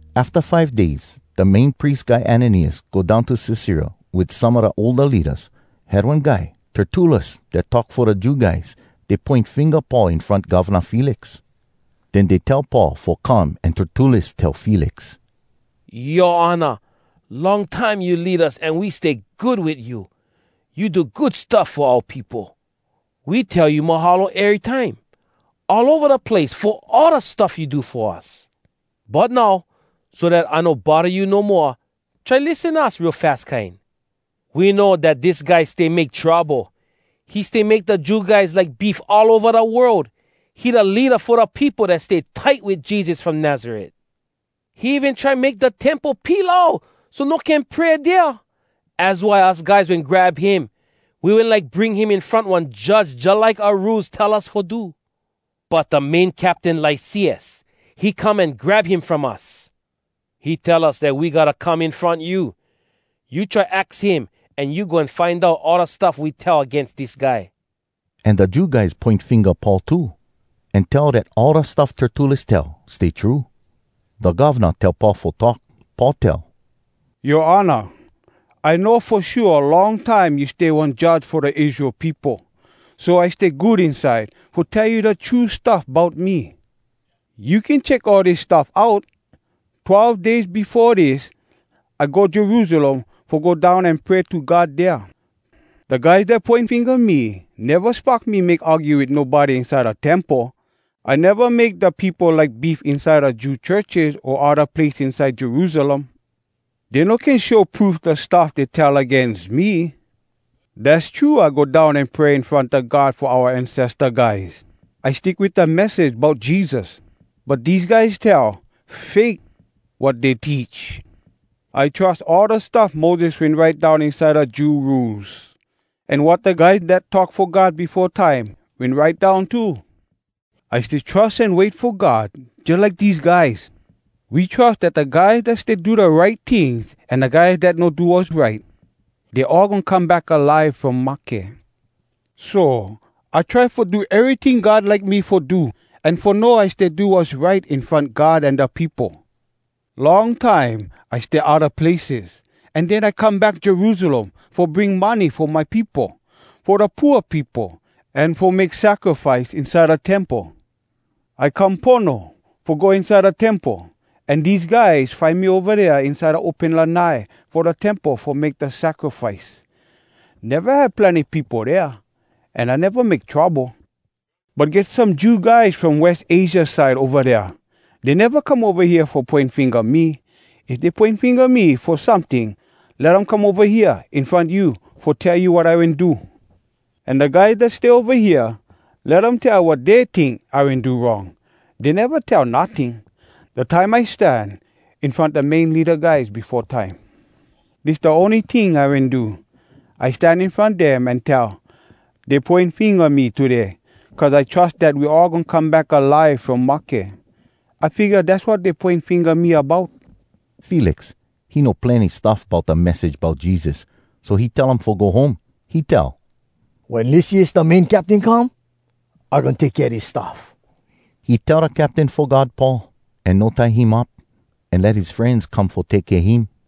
Afta five days da Main Pries Guy Ananias go down to Cesarea wit some a da older leadas. Had one guy Tertullus dat talk fo da Jew guys. Dey poin finga Paul in front Govna Felix. Den dey tell Paul fo come an Tertullus tell Felix, “Yoa Honor, long time you lead us an we stay good wit you. You do good stuff fo oua peopo. We tell you mahalo erytime all ova da place fo all da stuff you do fo us. But now, so dat I no bodda you no moa, try lissen us real fas kine. We know dat dis guy stay make trouble. He stay make da Jew guys like beef all ova da world. He da leada fo da peopo dat stay tight wit Jesus from Nazaret. He even try make da Temple pilau so no can pray dea. Az why us guys wen grab him. [We wen like bring him in front one judge jalike oua Rules tell us fo do. But da main captain Lysias, he come an grab him from us. He tell us dat we gotta come in front you.] You try aks him, an you goin find out all da stuff we tell agains dis guy.” An da Jew guys poin finga Paul too, an tell dat all da stuff Tertullus tell, stay true. Da govna tell Paul fo talk. Paul tell, “Yoa Honor, I know fo shua long time you stay one judge fo da Israel peopo. So I stay good inside fo tell you da true stuff bout me. You can check all dis stuff out. Twelve days befo dis, I go Jerusalem fo go down an pray to God dea. Da guys dat poin finga me neva spock me make argue wit nobody inside da Temple. I neva make da peopo like beef inside da Jew churches o odda place inside Jerusalem. Dey no can show proof da stuff dey tell agains me. Dass true I go down an pray in front da God fo oua ancesta guys. I stick wit da message bout Jesus. But dese guys tell, ‘Fake, wat dey teach!’ I trus all da stuff Moses wen write down inside da Jew Rules, an wat da guys dat talk fo God befo time wen write down too. I stay trus an wait fo God jalike dese guys. We trus dat da guys dat stay do da right tings an da guys dat no do wass right, dey all goin come back alive from mahke. So, I try fo do eryting God like me fo do, an fo know I stay do wass right in front God an da peopo. “Long time I stay odda places, an den I come back Jerusalem fo bring money fo my peopo, fo da pooa peopo, an fo make sacrifice inside da Temple. I come pono fo go inside da temple, an dese guys find me ova dea inside da open lanai fo da temple fo make da sacrifice. Neva have plenny peopo dea, an I neva make trouble. But get some Jew guys from West Asia side ova dea. Dey neva come ova hea fo poin finga me. If dey poin finga me fo someting, let um come ova hea in front you fo tell you wat I wen do. An da guys dat stay ova hea, let um tell wat dey tink I wen do wrong. Dey neva tell notting, da time I stan in front da main leada guys befo time. Dis da ony ting I wen do. I stan in front dem an tell, ‘Dey poin finga me today cuz I trus dat we all goin come back alive from mahke.’ I figga dass wat dey poin finga me about.” Felix, he know plenny stuff bout da message bout Jesus. So he tell um fo go home. He tell, “Wen Lysias, da main captain, come, I goin take kea dis stuff.” He tell da captain fo guard Paul, an no tie him up, an let his frenz come fo take kea him.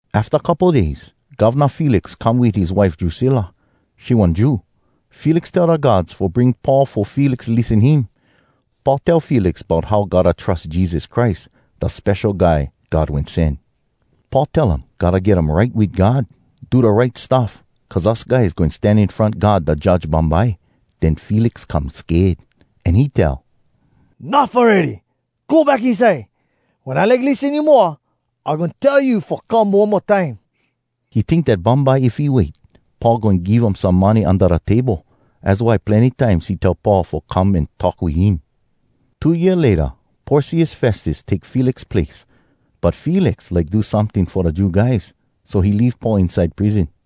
Afta couple days, Govna Felix come wit his wife Drusilla. She one Jew. Felix tell da guards fo bring Paul fo Felix lissen him. Paul tell Felix bout how gotta trus Jesus Christ, da Spesho Guy God Wen Sen. Paul tell um gotta get um right wit God, do da right stuff, cuz us guys goin stan in front God da Judge bumbye. Den Felix come sked, an he tell, “Nuff awready! Go back inside. Wen I like lissen you moa, I goin tell you fo come one mo time.” He tink dat bumbye if he wait, Paul goin give um some money unda da table. Az why plenny times he tell Paul fo come an talk wit him. Two year layta, Porcius Festus take Felix place, but Felix like do someting fo da Jew guys, so he leave Paul inside prison.